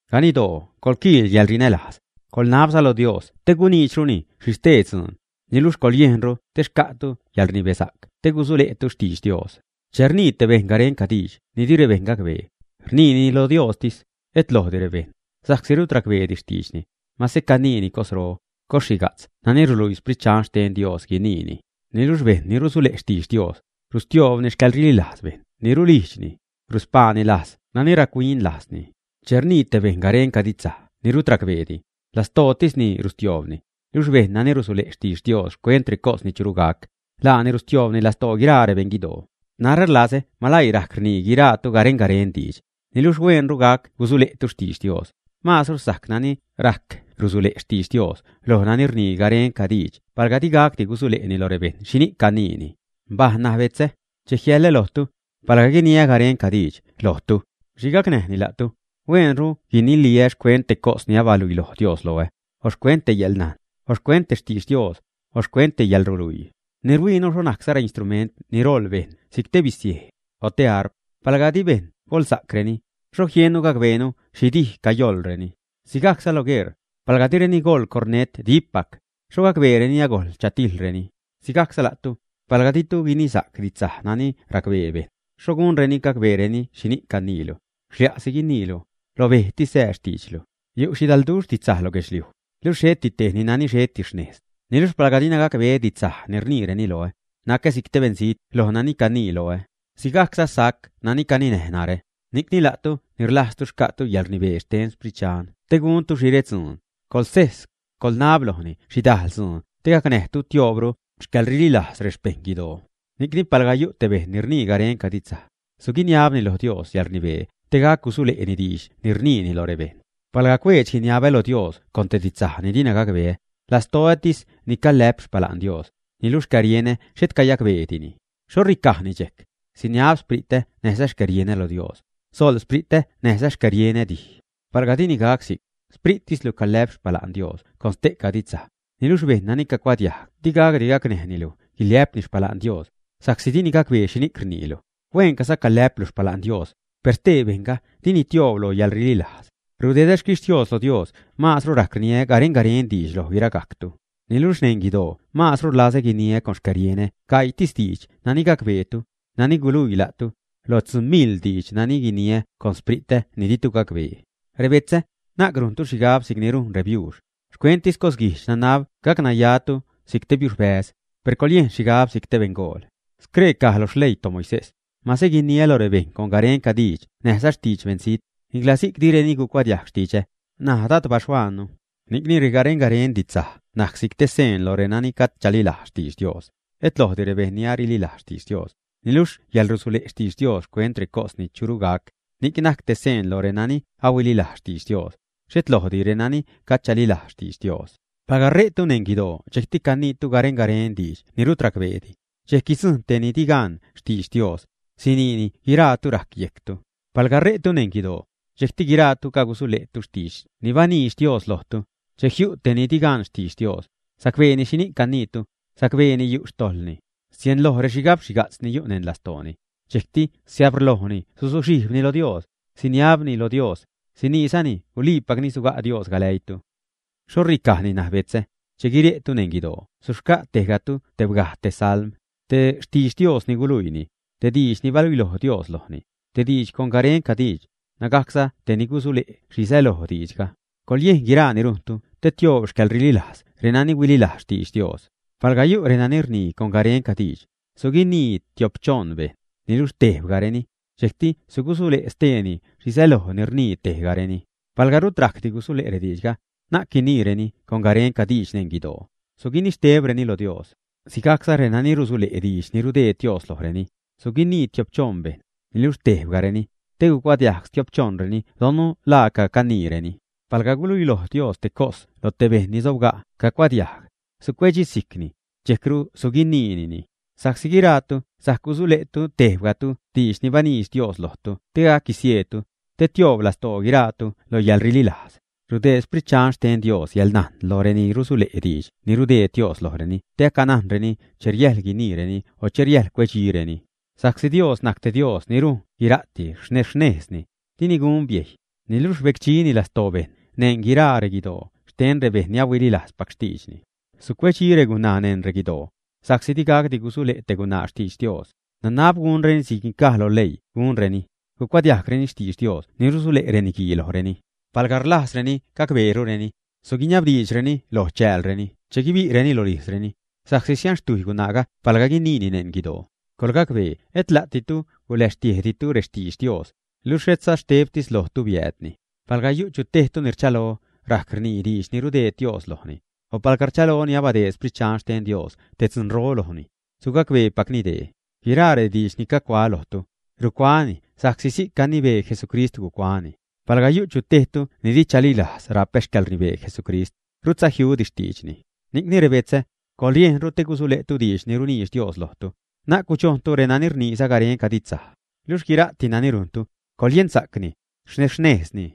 Ganiddoo coḻquiil yäḻrinälajz, coḻnabza lo Dios te guniidxruni xhi stee dzuun, niluxh coḻyejnru te xca'tu yäḻrnibesa'c te gusule'tu xtidx Dios. Che rnii te bejṉ garenca diidx ni di rebejṉ gacbee, rniini lo Diostis, et lojdi rebejṉ, sa'csi rut racbeedi xtiidxni, mase caniini cosro, cosxhiga'tz nani ruluii Sprit Dxan xten Dios guiniini. Niluxh bejṉ ni rusule' xtidx Dios, rustioobni xcäḻrililajz bejṉ ni rulijdxni, ruspaani lajz nani rac-huin lajzni. Che rnii te bejṉ garenca didxsaj ni rut racbeedi, lastootisni rustioobni, niluxh bejṉ nani rusule' xtidx Dios xcuent recos ni churu gac, laani rustiobruni lastoo guiraa rebeṉguidoo. Narä rlazä maläii rajc rnii guiraatu garen-garen diidx, niluxh hueenru gac gusule'tu xtidx Dios. Maazru sajc nani rajc rusule' xtidx Dios loj nani rnii garenca diidx palga di gacdi gusule'ni lo rebejṉ xhini'c caniini. Mbaj ṉaj betzä, che jiälä lojtu, palga guiniä garenca diidx lojtu, ¿xhi gacnäjni la'tu? Hueenru guiniliä xcuent te cos ni abaluiloj Dios loä, o xcuent te yäḻnajn, o xcuent te xtidx Dios, o xcuent te yäḻruluii. Ni ruhuiinu xho najcza reinstrument ni roḻ bejṉ si'c te bizej, o te harp; palga di bejṉ goḻsa'creni, ¿xho jiennu gacbeenu xhi dij cayoḻreni, ä? Sigajcza lo guerr, palga direni goḻ cornet dippac, ¿xho gacbeereni agojl chatijḻreni, ä? Sigajcza la'tu, palga ditu guinisa'c didxsaj nani racbee bejṉ, ¿xho gunreni gacbeereni xhini'c caniilu, ä? Xlia'si guiniilu, lo bejtis sää xtiidxlu. Yu' xhidalduxh didxsaj lo guedxliuj, luxh xheti tejni nani xheti xnejzni. Niluxh palga dina gacbeä didxsaj ni rniireni loä, nacä si'c te beṉzijt loj nani canii loä, sigajcza sajc nani caninäj narä. Ni'cni la'tu ni rlajztu xca'tu yäḻrnibee xten Sprit Dxan te guntu xhi redzuun, coḻguejs, coḻnab lojni xhidajl dzuun te gacnäjtu tioobru xcäḻrililajz rexpeṉ guidoo. Ni'cni palga yu' te bejṉ ni rnii garenca didxsaj, suguiniabni loj Dios yäḻrnibee te gac gusule'ni diidx ni rniini lo rebejṉ. Palga cuedx-guiniabä lo Dios con te didxsaj ni dina gacbeä, lastoätis ni calä'p xpala'n Dios, niluxh xcärienä xhet cayacbeedini. ¿Xho ricajni dxejc? Siniab xspritä näjza xcärienä lo Dios; soḻ xspritä näjza xcärienä dij. Palga dini gac si'c, xsprittislu calä'p xpala'n Dios con ste'ca didxsaj, niluxh bejṉ nani cacuadiajg di gacdi gacnäjnilu guiliä'pni xpala'n Dios, sa'csi dini gacbee xhini'c rniilu. Hueencaza calä'plu xpala'n Dios, per stee bejṉga dini tioob loj yäḻrililajz. Rudedä xquixtios lo Dios maazru rajc rniä garen-garen diidx loj guiragajctu. Niluxh neṉ guidoo maazru rlazä guiniä con xcärienä gaiitis diidx nani gacbeetu, nani guluii la'tu, loj tzuu miḻ diidx nani guiniä con xspritä ni ditu gacbee. Rebetzä, na'c rujntu xhigab si'cni rujn rebiuux, xcuenttis cosguijdx nanab gacnayatu si'c biuxbäz, per coḻyejn xhigab si'c te beṉgool. Scree caj lo xleii toMoisés: “Mase guiniä lo rebejṉ con garenca diidx näjza xtidx beṉzijt, nicla si'c direni gucuadiajg xtidxä”, naj Dad baxhuaannu. Ni'cni regaren-garen didxsaj najc si'c te seen lo renani gajd chalilajz xtidx Dios, et lojdi rebejṉ ni arililajz xtidx Dios. Niluxh yäḻrusule' xtidx Dios xcuent recos ni churu gac, ni'c najc te seen loj renani ahuililajz xtidx Dios, xhet lojdi renani gajd chalilajz xtidx Dios. Palga re'tu neṉ guidoo dxejcti caniitu garen-garen diidx ni rut racbeedi, dxejc guidzujṉ tej ni di gan xtidx Dios, siniini guiraatu rajc yejctu. Palga re'tu neṉ guidoo, dxejcti guiraatu cagusule'tu xtidx ni baniidx Dios lojtu, che jiu' tej ni di gan xtidx Dios, sacbeeni xhini'c caniitu, sacbeeni yu' xtojḻni, sienloj rexhigab xhiga'tz ni yu' neṉ lastooni, dxejcti siabrlojni suzuxhijbni lo Dios, siniabni lo Dios, siniizani guliipacni suga' Dios galäiitu. ¿Xho ricajni ṉaj, betzä? Che guire'tu neṉ guidoo suxca' tejgatu tebgaj te salm, te xtidx Dios ni guluiini, te diidx ni baluiloj Dios lojni, te diidx con garenca diidx, nägajcza te ni gusule' xhi säloj diidxga. Coḻyejn guiraa ni rujntu te tioob xcäḻrililajz renani ahuililajz xtidx Dios. Palga yu' renani rnii con garenca diidx, suguinii tio'p-choṉ bejṉ, niluxh tebgajreni, dxejcti sugusule' steeni xhi säloj ni rnii tejgareni. Palga rut rajcdi gusule' rediidxga, na'c guiniireni con garenca diidx neṉ guidoo, suguinixtebreni lo Dios. Si'cza renani rusule' diidx ni rudeed Dios lojreni, suguinii tio'p-choṉ bejṉ, niluxh tebgajreni, te cuadiajg stiop xchoṉreni donnu la laaca caniireni. Palga guluiloj Dios te cos loj te bejṉ ni sobga' cacuadiajg, sucuedxisijcni, dxejcru suguiniini. Sa'csi guiraatu sajc gusule'tu tebgajtu didx ni baniidx Dios lojtu te gac guisieedtu, te tioob lastoo guiraatu lo yäḻrililajz. Rudeed Sprit Dxan xten Dios yäḻnajn loj reni rusule' diidx ni rudeed Dios lojreni te acanajnreni che riäjl guiniireni o che riäjl cuedxireni, sa'csi Dios najc te Dios ni rujn guira'ti xnejz-xnejzni, dini gun biejy, niluxh rbecdxini lastoo bejṉ neṉ guiraa reguidoo xten rebejṉ ni ahuililajzpac xtiidxni. Sucuedxi regunaa neṉ reguidoo, sa'csi di gacdi gusule' te gunaa xtidx Dios. Nanab gunreni si'c caj lo leii gunreni, gucuadiajgreni xtidx Dios ni rusule' reniguii lojreni. Palga rlajzreni gacbeerureni, suguiniabdiidxreni loj chäälni che guibi'reni rolijzreni, sa'csi sianxtujy gunaaga palga guiniini neṉ guidoo. Coḻgacbee et la'ditu guläxtiejditu rextidx Dios, luxh etza xtebtis lojtu biäädni. Palga yu' tejtu ni rchalo rajc rniini diidx ni rudeed Dios lojni, o palga rchaloni abadeed Xprit Dxan xten Dios te dzunro lojni, sugacbeepacni dee: guiraa rediidx ni cagucuaä lojtu, rucuaäni sa'csi si'c gunibee Jesucrist gucuaäni. Palga yu' chu tejtu ni di chalilajz rapä xcäḻrnibee Jesucrist, rutza jiudi xtiidxni. Ni'cni, rebetzä, coḻyejnru te gusule'tu diidx ni runiidx Dios lojtu, na'c gudxojntu renani rniiza garenca didxsaj. Luxh guira'ti nani rujntu, coḻyensa'cni, xnejz-xnejzni.